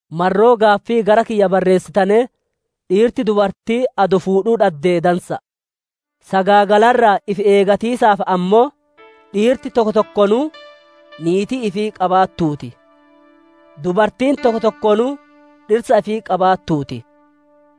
Marroo gaaffii gara kiyya barreessitanee dhiirti dubartii adoo fuudhuu dhaddee dansa'a. Sagaagala irraa ifi eegatiisaaf ammoo, dhiirti tokko tokkoonuu niitii ifii qabaattuu ti; dubartiin tokko tokkoonuu dhirsa ifii qabaattuu ti.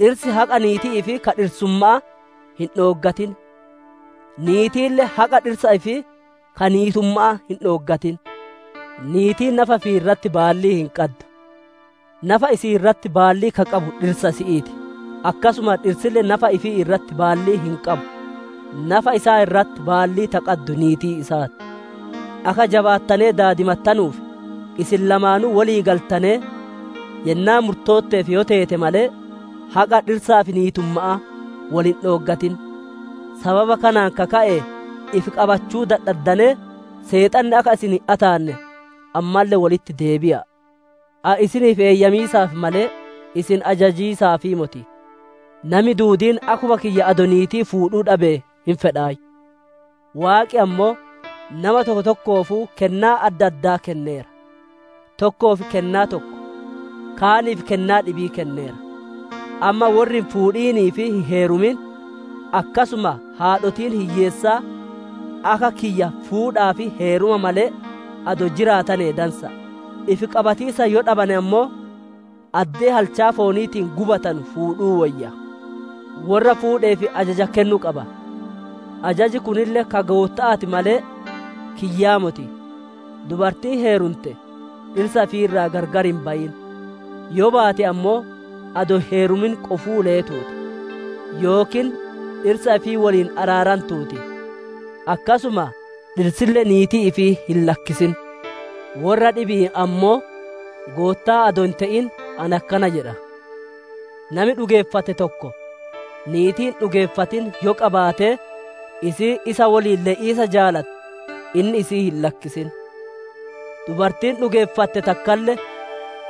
Dhirsi haqa niitii ifii ka dhirsumma'aa hin dhooggatin; niitiille haqa dhirsa ifii ka niitumma'aa hin dhooggatin. Niitiin nafa ifii irratti baallii hin qaddu; nafa isi'ii irratti baallii ka qabu dhirsa isi'ii ti. Akkasuma dhirsille nafa ifii irratti baallii hin qabu; nafa isaa irratti baallii ta qaddu niitii isaa ti. Akka jabaattanee daadimattanuuf isin lamaanuu wolii galtanee yennaa murtootteef yoo teete malee, haqa dhirsaa fi niitumma'aa wol hin dhooggatin. Sababa kanaan ka ka'e ifi qabachuu dadhaddanee Seexanni akka isin hin ataanne, ammalle wolitti deebi'a'a. Ani isiniif eeyyamiisaaf malee, isin ajajiisaafii moti. Nami duudiin akkuma kiyya adoo niitii fuudhuu dhabe hin fedhaayyu. Waaqi ammoo nama tokko tokkoofuu kennaa adda addaa kenneera. Tokkoof kennaa tokko, kaaniif kennaa dhibii kenneera. Amma worri hin fuudhinii fi hin heerumin, akkasuma haadhotiin hiyyeessaa akka kiyya fuudhaa fi heeruma malee adoo jiraatane dansa'a. Ifi qabatiisa yoo dadhabane ammoo, addee halchaa fooniitiin gubatanu fuudhuu woyya. Worra fuudheef ajaja kennu qaba; ajaji kunille ka Gootta'aa ti malee kiyyaa moti. Dubartiin heerumte dhirsa ifii irraa gargar hin bayin; yoo baate ammoo, adoo hin heerumin qofuu leetuu ti; yookiin dhirsa ifii woliin araarantuu ti. Akkasuma dhirsille niitii ifii hin lakkisin. Worra dhibi'iin ammoo Goottaa adoo hin te'in, ani akkana jedha. Nami dhugeeffate tokko niitii hin dhugeeffatin yoo qabaatee isiin isa woliin le'iisa jaalatte, inni isii hin lakkisin. Dubartiin dhugeeffatte takkalle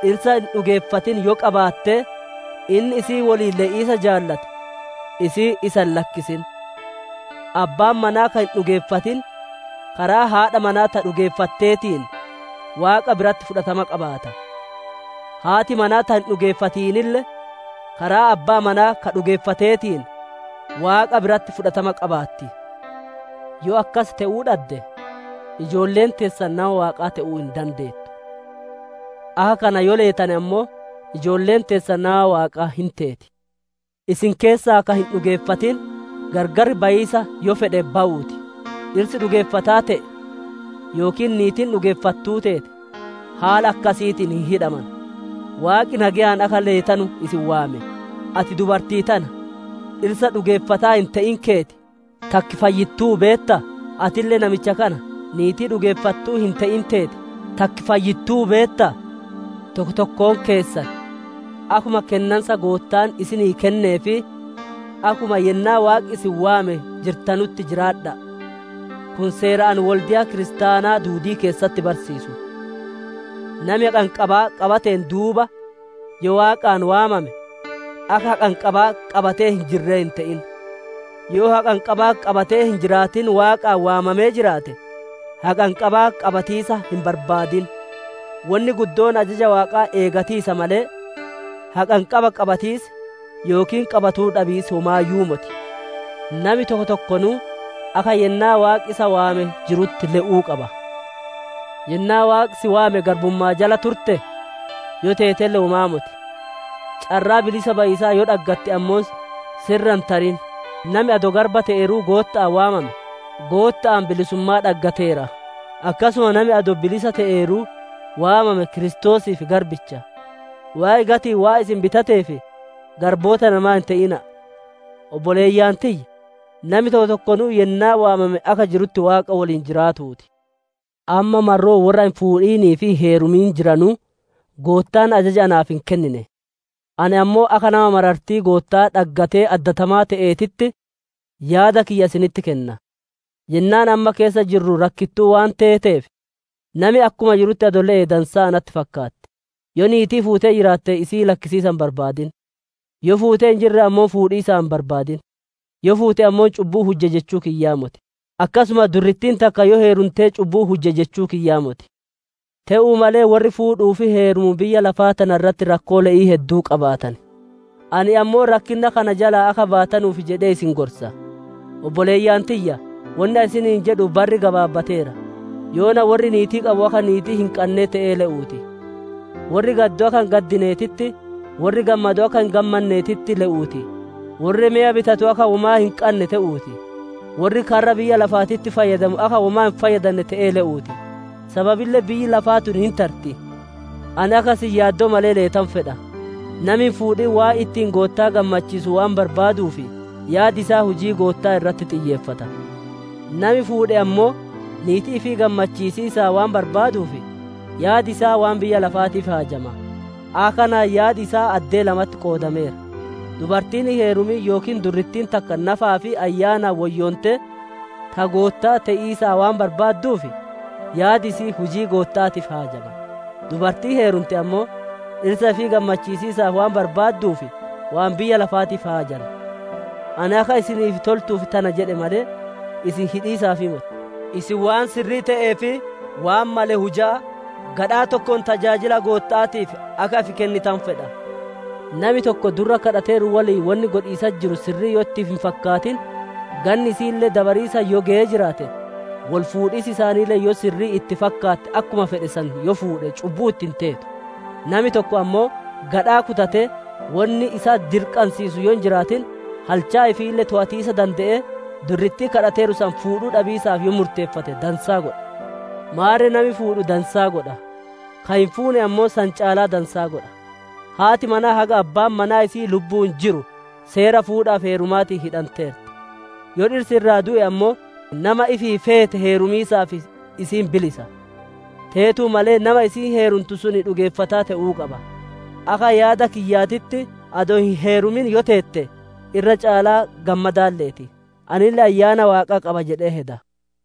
dhirsa hin dhugeeffatin yoo qabaattee inni isii woliin le'iisa jaalate, isiin isa hin lakkisin. Abbaan manaa ka hin dhugeeffatin karaa haadha manaa ta dhugeeffatteetiin Waaqaa biratti fudhatama qabaata; haati manaa ta hin dhugeeffatinille karaa abbaa manaa ka dhugeeffateetin Waaqa biratti fudhatama qabaatti. Yoo akkas te'uu dhadde, ijoolleen teessan nama Waaqaa te'uu hin dandeettu. Akka kana yoo leetane ammoo, ijoolleen teessan nama Waaqaa hin teeti. Isin keessaa ka hin dhugeeffatin gargar bayiisa yoo fedhe bayuu ti. Dhirsi dhugeeffataa te'e yookiin niitiin dhugeeffattuu teete, haala akkasiitiin hin hidhamanu. Waaqi nageyaan akka leetanu isin waame. Ati dubartii tana, dhirsa dhugeeffataa hin te'in keeti, takki fayyittuu beettaa? Atille namicha kana, niitii dhugeeffattuu hin te'in teeti, takki fayyittuu beettaa? Tokko tokkoon keessan akkuma kennansa Goottaan isinii kennee fi akkuma yennaa Waaqi isin waame jirtanutti jiraadha'a. Kun seera ani wolde'a kiristaanaa duudii keessatti barsiisu. Nami haqanqabaa qabateen duuba yoo Waaqaan waamame, akka haqanqabaa qabatee hin jirree hin te'in; yoo haqanqabaa qabatee hin jiraatin Waaqaan waamamee jiraate haqanqabaa qabatiisaa hin barbaadin. Wonni guddoon ajaja Waaqaa eegatiisa malee, haqanqabaa qabatiis yookiin qabatuu dhabiis womaayyuu moti. Nami tokko tokkoonuu akka yennaa Waaqi isa waame jirutti le'uu qaba. Yennaa Waaqi si waame garbummaa jala turtee? Yoo teetelle womaa moti. Carraa bilisa bayiisaa yoo dhaggatte ammoo si irra hin tarin. Nami adoo garba te'eeruu Gootta'aan waamame, Gootta'aan bilisummaa dhaggateera; akkasuma nami adoo bilisa te'eeruu waamame Kiristoosiif garbicha. Waaqi gati'iin waan isin bitateef, garboota namaa hin te'ina'a. Obboleeyyan tiyya! Nami tokko tokkonuu yennaa waamame akka jirutti Waaqa woliin jiraatuu ti. Amma marroo worra hin fuudhinii fi hin heerumin jiranuu, Goottaan ajaja naaf hin kennine. Ani ammoo, akka nama marartii Gootta'aa dhaggatee addatamaa te'eetitti, yaada kiyya isinitti kenna. Yennaan amma keessa jirru rakkittuu waan iteeteef, nami akkuma jirutti adoo le'e dansaa natti fakkaatti. Yoo niitii fuutee jiraatte isii lakkisiisaa hin barbaadin, Yoo fuutee hin jirre ammoo fuudhiisaa hin barbaadin. Yoo fuute ammoo, cubbuu hujje jechuu kiyyaa moti; akkasuma durrittiin takka yoo heerumte cubbuu hujje jechuu kiyyaa moti. Te'uu malee worri fuudhuu fi heerumu biyya lafaa tana irratti rakkoo le'ii hedduu qabaatan; ani ammoo, rakkinna kana jalaa akka baatanuuf jedhee isin gorsa. Obboleeyyan tiyya! Wonni ani isiniin jedhu barri gabaabbateera; yoona worri niitii qabu akka niitii hin qannee te'ee le'uu ti. Worri gaddu akka hin gaddineetitti, worri gammadu akka hin gammanneetitti le'uu ti; worri meya bitatu akka womaa hin qannee te'uu ti. Worri karra biyya lafaatitti fayyadamu akka womaa hin fayyadannee te'ee le'uu ti. Sababille biyyi lafaa tun hin tarti. Ani akka isin yaaddoo malee leetanu fedha. Nami hin fuudhin waan ittiin Goottaa gammachiisu waan barbaaduuf, yaadi isaa hujii Gootta'aa irratti xiyyeeffata. Nami fuudhe ammoo, niitii ifii gammachiisiisaa waan barbaaduuf, yaadi isaa waan biyya lafaatiif haajama. Akka kanaan yaadi isaa addee lamatti qoodameera. Dubartiin hin heerumin yookiin durrittiin takka nafaa fi ayyaanaan woyyoontee ta Gootta'aa te'iisa waan barbaadduuf, yaadi isi'ii hujii Gootta'aatiif haajama; dubartiin heerumte ammoo, dhirsa ifii gammachiisiisaaf waan barbaadduuf waan biyya lafaatiif haajanti. Ani akka isiniif toltuuf tana jedhe malee, isin hidhiisaaf moti. Isin waan sirrii te'ee fi waan male hujaa, gadhaa tokkoon tajaajila Gootta'aatiif akka ifi kennitanu fedha. Nami tokko durra kadhateeru woliin wonni godhiisatti jiru sirrii yoo itti hin fakkaatin, ganni isi'iille dabariisa yoo geyee jiraate, woli fuudhiisi isaaniille yoo sirrii itti fakkaatte akkuma fedhe san yoo fuudhe cubbuu itti hin teetu. Nami tokko ammoo, gadhaa kutatee, wonni isa dirqansiisu yoo hin jiraatin, halchaa ifiille toowatiisa dande'ee, durrittii kadhateeru san fuudhuu dhabiisaaf yoo murteeffate dansaa godhe. Maarre nami fuudhu dansaa godha; ka hin fuune ammoo san caalaa dansaa godha. Haati manaa haga abbaan manaa isi'ii lubbu'uun jiru seera fuudhaa fi heerumaatiin hidhanteerti; yoo dhirsi irraa du'e ammoo, nama ifii feete heerumiisaaf isiin bilisa. Teetuu malee nami isiin heerumtu sun dhugeeffataa te'uu qaba. Akka yaada kiyyaatitti adoo hin heerumin yoo teette, irra caalaa gammadaan leeti. Anille Ayyaana Waaqaa qaba jedhee heda.